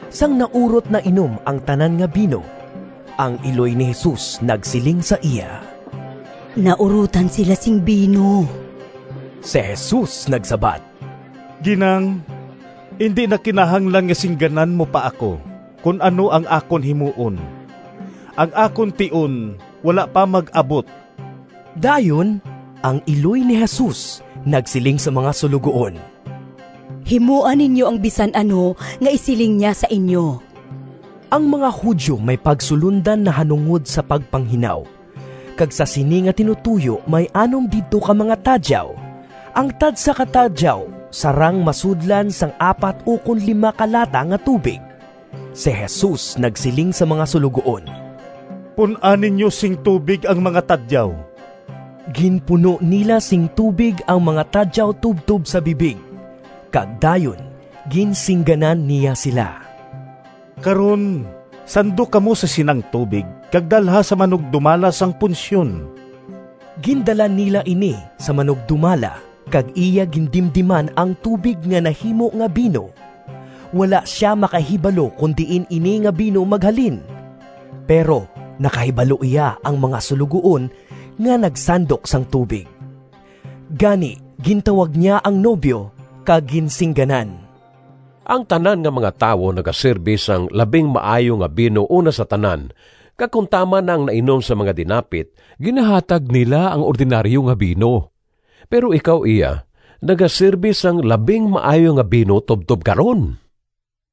Sang naurot na inom ang tanan nga bino, ang iloy ni Jesus nagsiling sa iya, “Naurotan sila sing bino.” Si Jesus nagsabat, “Ginang, indi na kinahanglan nga singganan mo pa ako kon ano ang akon himuon. Ang akon tion wala pa mag-abot.” Dayon, ang iloy ni Jesus nagsiling sa mga suloguon, “Himoa ninyo ang bisan ano nga isiling niya sa inyo.” Ang mga Judio may pagsulondan nahanungod sa pagpanghinaw, kag sa sini nga tinutoyo may anom didto ka mga tadyaw, ang tagsa ka tadyaw sarang masudlan sang apat ukon lima ka lata nga tubig. Si Jesus nagsiling sa mga suloguon, “Pun-a ninyo sing tubig ang mga tadyaw.” Ginpuno nila sing tubig ang mga tadyaw tubtob sa bibig, kag dayon ginsingganan niya sila, “Karon, sandok kamo sa sinang tubig kag dalha sa manugdumala sang punsyon.” Gindala nila ini sa manugdumala, kag iya gindimdiman ang tubig nga nahimo nga bino. Wala sia makahibalo kon diin ini nga bino maghalin (pero nakahibalo iya ang mga suloguon nga nagsandok sang tubig). Gani gintawag niya ang nobyo kag ginsingganan, “Ang tanan nga mga tawo nagasirbe sang labing maayo nga bino una sa tanan kag kon tama na ang nainom sang mga dinapit, ginahatag nila ang ordinaryo nga bino. Pero ikaw iya nagasirbe sang labing maayo nga bino tubtob karon!”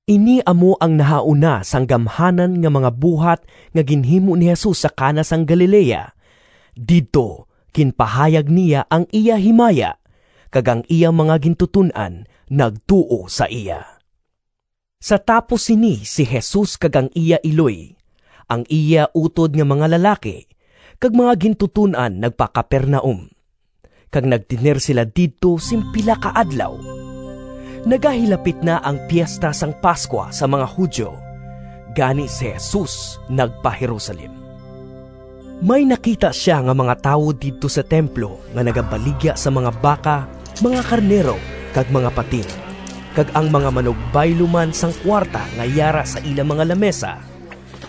Ini amo ang nahauna sang gamhanan nga mga buhat nga ginhimo ni Jesus sa Cana sang Galilea. Didto ginpahayag niya ang iya himaya, kag ang iya mga gintuton-an nagtuo sa iya. Sa tapos sini si Jesus kag ang iya iloy, ang iya utod nga mga lalaki, kag mga gintuton-an nagpa-Capernaum, kag nagtener sila didto sing pila ka adlaw. Nagahilapit na ang Piesta sang Pascua sang mga Judio, gani si Jesus nagpa-Jerusalem. May nakita sia nga mga tawo didto sa templo nga nagabaligya sang mga baka, mga karnero, kag mga pating, kag ang mga manugbaylo man sang kuwarta nga yara sa ila mga lamisa.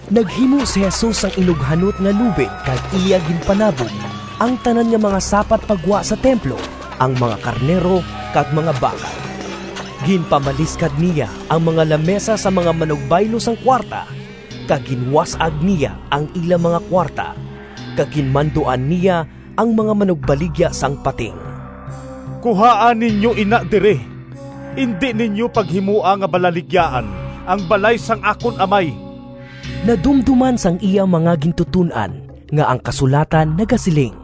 Naghimo si Jesus sang inughanot nga lubid kag iya ginpanabog ang tanan nga mga sapat pa gwa sa templo, ang mga karnero kag mga baka. Ginpamaliskad niya ang mga lamisa sang mga manugbaylo sang kuwarta, kag ginwas-ag niya ang ila mga kuwarta; kag ginmanduan niya ang mga manugbaligya sang pating, “Kuhaa ninyo ina diri! Indi ninyo paghimoa nga balaligyaan ang balay sang akon Amay!” Nadumdoman sang iya mga gintuton-an nga ang kasulatan nagasiling,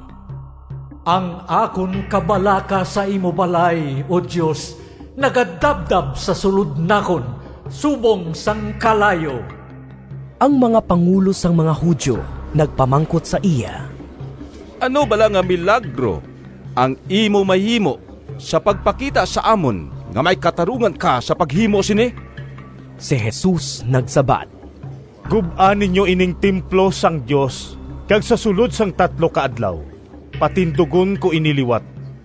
“Ang akon kabalaka sa imo balay, O Dios, nagadabdab sa sulod nakon subong sang kalayo.” Ang mga pangulo sang mga Judio nagpamangkot sa iya, “Ano bala nga milagro ang imo mahimo sa pagpakita sa amon nga may katarungan ka sa paghimo sini?” Si Jesus nagsabat, “Gub-a ninyo ining templo sang Dios kag sa sulod sang tatlo ka adlaw patindugon ko ini liwat.”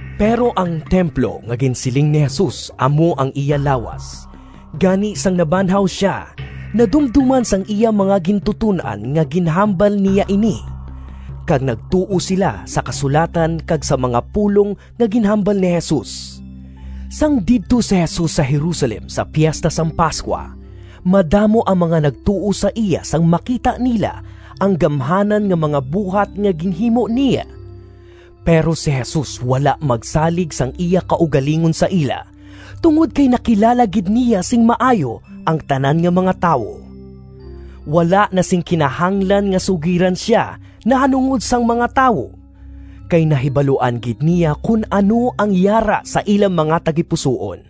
Pero ang templo nga ginsiling ni Jesus amo ang iya lawas. Gani sang nabanhaw sia, nadumdoman sang iya mga gintuton-an nga ginhambal niya ini, kag nagtuo sila sa kasulatan kag sa mga pulong nga ginhambal ni Jesus. Sang didto si Jesus sa Jerusalem sa Piesta sang Pascua, madamo ang mga nagtuo sa iya sang makita nila ang gamhanan nga mga buhat nga ginhimo niya. Pero si Jesus wala magsalig sang iya kaugalingon sa ila, tungod kay nakilala gid niya sing maayo ang tanan nga mga tawo. Wala na sing kinahanglan nga sugiran sia nahanungod sang mga tawo, kay nahibaluan gid niya kon ano ang yara sa ila mga tagipusoon.